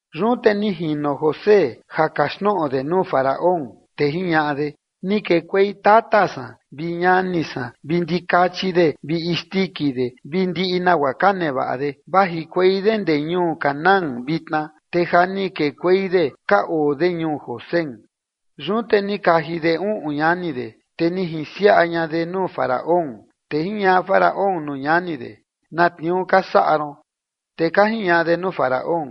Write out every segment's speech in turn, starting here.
Yun te ni jino José ja kaxtnoꞌo de nuu Faraón, te jiñaꞌa de: ―Ni kekuei tata san vi ñani san vi ndikachi de vi isndiki de vi ndiꞌi nagua ka nevaꞌa de, vajikuei de ndee ñuu Canaán vitna, te ja ni kekuei de ka oo de ñuu Gosén. Yun te ni kaji de uꞌun ñani de, te ni jinsiaꞌa ña de nuu Faraón. Te jiñaꞌa Faraón nuu ñani de: ―¿Na tniuu ka saꞌa ron? Te ka jiñaꞌa de nuu Faraón: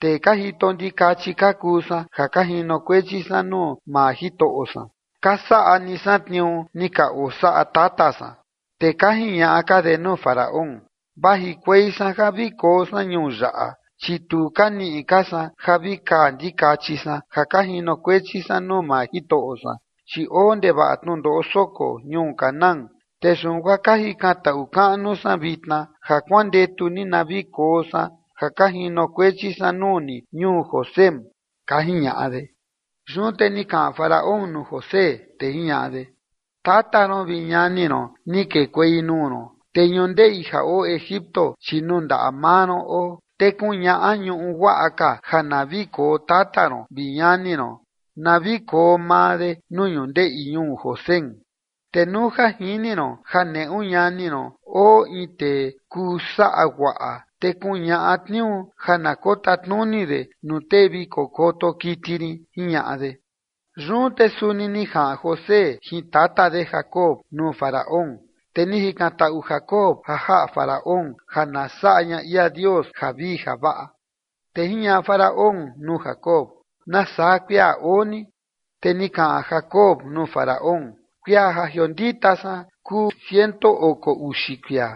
―Tee ka jito ndikachi ka kuu san ja ka jinokuechi san nuu maa jitoꞌo san, ka saꞌa ni san tniuu ni ka osaꞌa tata san. Te ka jiñaꞌa ka de nuu Faraón: ―Vajikuei san ja vi koo san ñuu yaꞌa, chi tu ka niꞌi ka san ja vi kaa ndikachi san ja ka jinokuechi san nuu maa jitoꞌo san. Chi oo ndevaꞌa tnundoꞌo soko ñuu Canaán, te yun guaa ka jikantaꞌu kaꞌnu san vitna ja kuandetu ni na vi koo san ja ka jinokuechi san nuu ni ñuu Gosén ―ka jiñaꞌa de. Yun te ni kaꞌan Faraón nuu José, te jiñaꞌa de: ―Tata ron vi ñani ron ni kekuei nuu ron. Te ñundeꞌi ja oo Egipto, chi nuu ndaꞌa maa ron oo. Te kuñaꞌa ñuꞌu guaꞌa ka ja na vi koo tata ron vi ñani ron, na vi koo maa de nuu ñundeꞌi ñuu Gosén, te nuu ja jini ron ja neꞌu ñani ron oo in tee kuu saꞌa guaꞌa, te kuñaꞌa tniuu ja na kotatnuni de nuu tee vi kokoto kiti rin ―jiñaꞌa de. Yun te suni ni jaꞌan José jin tata de Jacob nuu Faraón, te ni jikantaꞌu Jacob ja jaꞌa Faraón ja na saꞌa ña ia Dios javii javaꞌa. Te jiñaꞌa Faraón nuu Jacob: ―¿Nasaa kuia oo ni? Te ni kaꞌan Jacob nuu Faraón: ―Kuia ja jiondita san kuu ciento oko uxi kuia,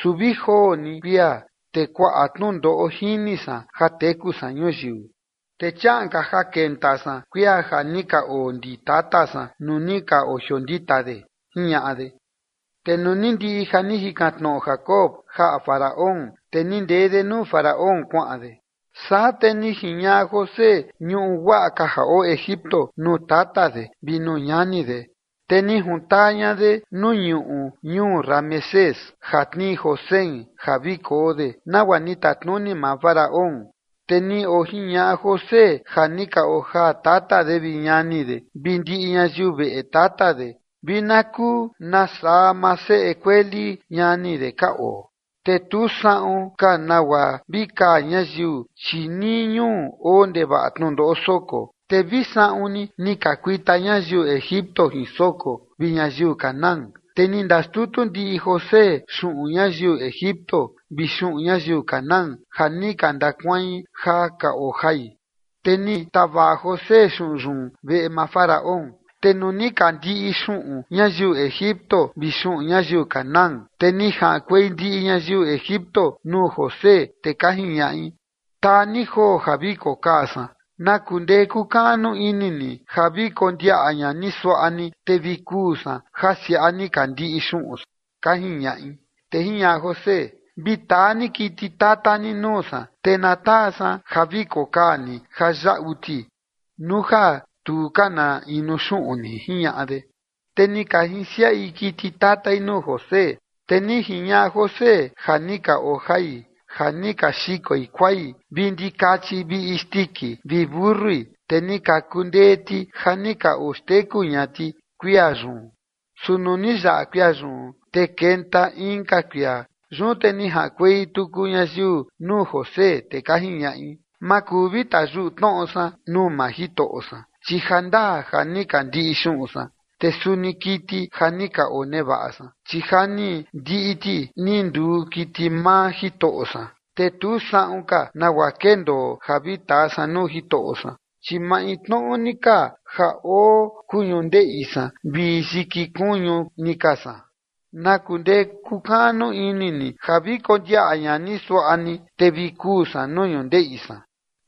su vi joo ni kuia te kuaꞌa tnundoꞌo jini san ja teku san ñuyiu, te chiaꞌan ka ja kenta san kuia ja ni ka oo ndi tata san nuu ni ka ojiondita de ―jiñaꞌa de. Te nuu ni ndiꞌi ja ni jikantaꞌu Jacob jaꞌa Faraón, te ni ndee de nuu Faraón kuaꞌan de. Saa te ni jiñaꞌa José ñuꞌu guaꞌa ka ja oo Egipto nuu tata de vi nuu ñani de, te ni juntaa ña de nuu ñuꞌu ñuu Ramesés ja tnii Gosén ja vi koo de, nagua ni tatnuni maa Faraón. Te ni ojiñaꞌa José ja ni ka ojaa tata de vi ñani de vi ndiꞌi ñayiu veꞌe tata de vi na kuu na saa maa seꞌe kueli ñani de ka oo. Te tu saꞌun ka nagua vi kaa ñayiu, chi nii ñuu oo ndevaꞌa tnundoꞌo soko, te vi saꞌun ni ni ka kuita ñayiu Egipto jin soko vi ñayiu Canaán. Te ni ndaxtutu ndiꞌi José xuꞌun ñayiu Egipto vi xuꞌun ñayiu Canaán ja ni ka ndakuain ja ka ojai, te ni tavaꞌa José xuꞌun yun veꞌe maa Faraón. Te nuu ni ka ndiꞌi xuꞌun ñayiu Egipto vi xuꞌun ñayiu Canaán, te ni jaꞌankuei ndiꞌi ñayiu Egipto nuu José, te ka jiñaꞌi: ―Taa ni joo ja vi kokaa san. ¿Na kundee kuu kaꞌnu ini ni ja vi kondiaꞌa ña ni suaꞌa ni, te vi kuu san ja siaꞌa ni ka ndiꞌi xuꞌun san? ―ka jiñaꞌi. Te jiñaꞌa José: ―Vi taa ni kiti tata ni nuu saa, te na taa san ja vi kokaa ni ja yaꞌu ti, nuu ja tu ka na inuu xuꞌun ni ―jiñaꞌa de. Te ni ka jinsiaꞌi kiti tatai nuu José, te ni jiñaꞌa José ja ni ka ojai ja ni ka xikoi kuai vi ndikachi vi isndiki vi mentui, te ni ka kundee ti ja ni ka oxteku ña ti kuia yun. Su nuu ni yaꞌa kuia yun, te kenta inka kuia. Yun te ni jaꞌankuei tuku ñayiu nuu José, te ka jiñaꞌi: ―Ma kuu ja vi tayuꞌu tnoꞌo san nuu maa jitoꞌo san, chi jandaa ja ni ka ndiꞌi xuꞌun san, te suni kiti ja ni ka onevaꞌa san, chi ja ni ndiꞌi ti ni nduu kiti maa jitoꞌo san, te tu saꞌun ka nagua kendoo ja vi taa san nuu jitoꞌo san, chi maintnoꞌo ni ka ja oo kuu ñundeꞌi san vi yiki kuñu ni ka san. ¿Na kundee kukaꞌnu ini ni ja vi kondiaꞌa ña ni suaꞌa ni, te vi kuu san nuu ñundeꞌi san?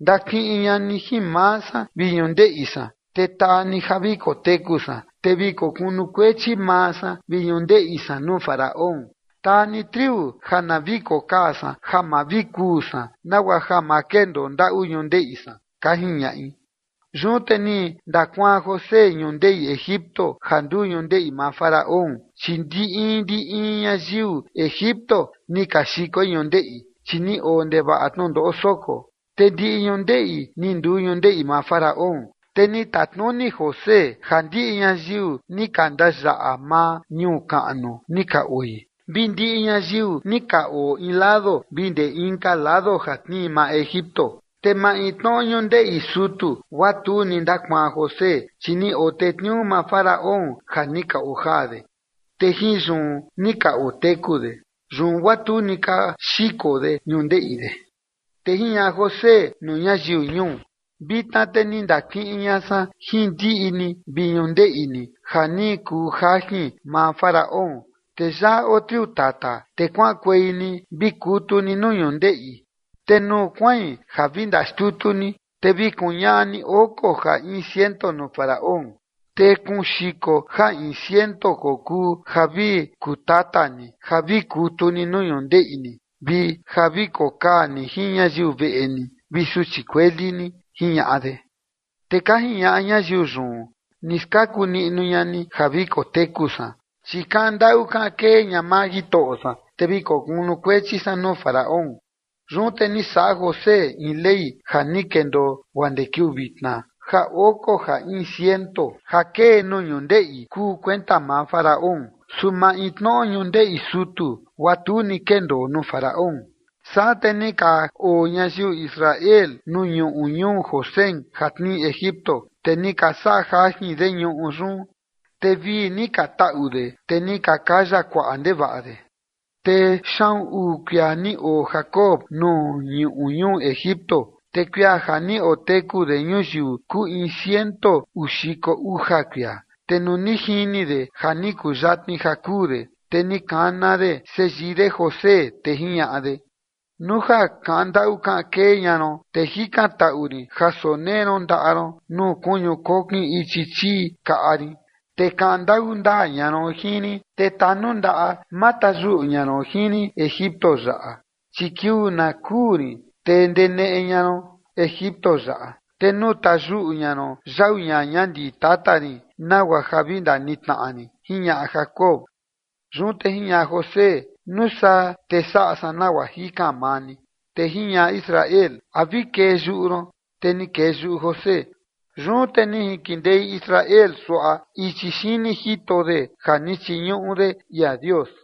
Ndakiꞌin ña ni jin maa san vi ñundeꞌi san, te taa ni ja vi koteku san, te vi kokunukuechi maa san vi ñundeꞌi san nuu Faraón. Taa ni triu na vi kokaa san ja ma vi kuu san nagua ja ma kendoo ndaꞌu ñundeꞌi san ―ka jiñaꞌi. Yun te ni ndakuaan José ñundeꞌi Egipto ja nduu ñundeꞌi maa Faraón, chi ndi in ndi in ñayiu Egipto ni ka xikoi ñundeꞌi, chi ni oo ndevaꞌa tnundoꞌo soko, te ndiꞌi ñundeꞌi ni nduu ñundeꞌi maa Faraón. Te ni tatnuni José ja ndiꞌi ñayiu ni ka ndayaꞌa maa ñuu kaꞌnu ni ka oi, vi ndiꞌi ñayiu ni ka oo in lado vi ndee inka lado ja tnii maa Egipto. Te maintnoꞌo ñundeꞌi sutu guaa tu ni ndakuaan José, chi ni otetniuu maa Faraón ja ni ka ojaa de, te jin yun ni ka oteku de. Yun guaa tu ni ka xiko de ñundeꞌi de. Te jiñaꞌa José nuu ñayiu ñuu: ―Vitna te ni ndakiꞌin ña san jin ndiꞌi ni vi ñundeꞌi ni ja ni kuu jajin maa Faraón, te yaꞌa oo triu tata, te kuaꞌankuei ni vi kutu ni nuu ñundeꞌi. Te nuu kuain ja vi ndaxtutu ni, te vi kuñaꞌa ni oko ja in ciento nuu Faraón, te kuun xiko ja in ciento kokuu ja vi kutata ni ja vi kutu ni nuu ñundeꞌi ni vi ja vi kokaa ni jin ñayiu veꞌe ni vi suchi kueli ni ―jiñaꞌa de. Te ka jiñaꞌa ñayiu yun: ―Ni skaku niꞌnu ña ni ja vi koteku san, chi kaꞌan ndaꞌu kaꞌan kee ña maa jitoꞌo san, te vi kokunukuechi san nuu Faraón. Yun te ni saꞌa José in ley ja ni kendoo guaa ndee kiuu vitna ja oko ja in ciento ja kee nuu ñundeꞌi kuu kuenta maa Faraón, su maintnoꞌo ñundeꞌi sutu, guaa tu ni kendoo nuu Faraón. Saa te ni ka oo ñayiu Israel nuu ñuꞌu ñuu Gosén ja tnii Egipto, te ni ka saꞌa jajin de ñuꞌu yun, te vii ni ka taꞌu de, te ni ka kaya kuaꞌa ndevaꞌa de. Te xaꞌun uu kuia ni oo Jacob nuu ñuꞌu ñuu Egipto, te kuia ja ni oteku de ñuyiu kuu in ciento uu xiko uja kuia. Te nuu ni jini de ja ni kuyatni ja kuu de, te ni kana de seyii de José te jiñaꞌa de: ―Nuu ja kaꞌan ndaꞌu kaꞌan kee ña ron, te jikantaꞌu rin ja sonee ron ndaꞌa ron nuu kuñu kokin ichi chii kaꞌa rin, te kaꞌan ndaꞌu ndaa ña ron jin rin, te tanundaꞌa ma tayuꞌu ña ron jin rin Egipto yaꞌa. Chi kiuu na kuu rin te ndeneꞌe ña ron Egipto yaꞌa, te nuu tayuꞌu ña ron yau ñaña ndi tata rin nagua ja vi ndanitnaꞌa rin ―jiñaꞌa Jacob. Yun te jiñaꞌa José: ―Nuu saa te saꞌa san nagua jikan maa ni. Te jiñaꞌa Israel: ―¿A vi kee yuꞌu ron? Te ni kee yuꞌu José. Yun te ni jinkindei Israel suaꞌa ichi xini jito de ja ni chiñuꞌu de ia Dios.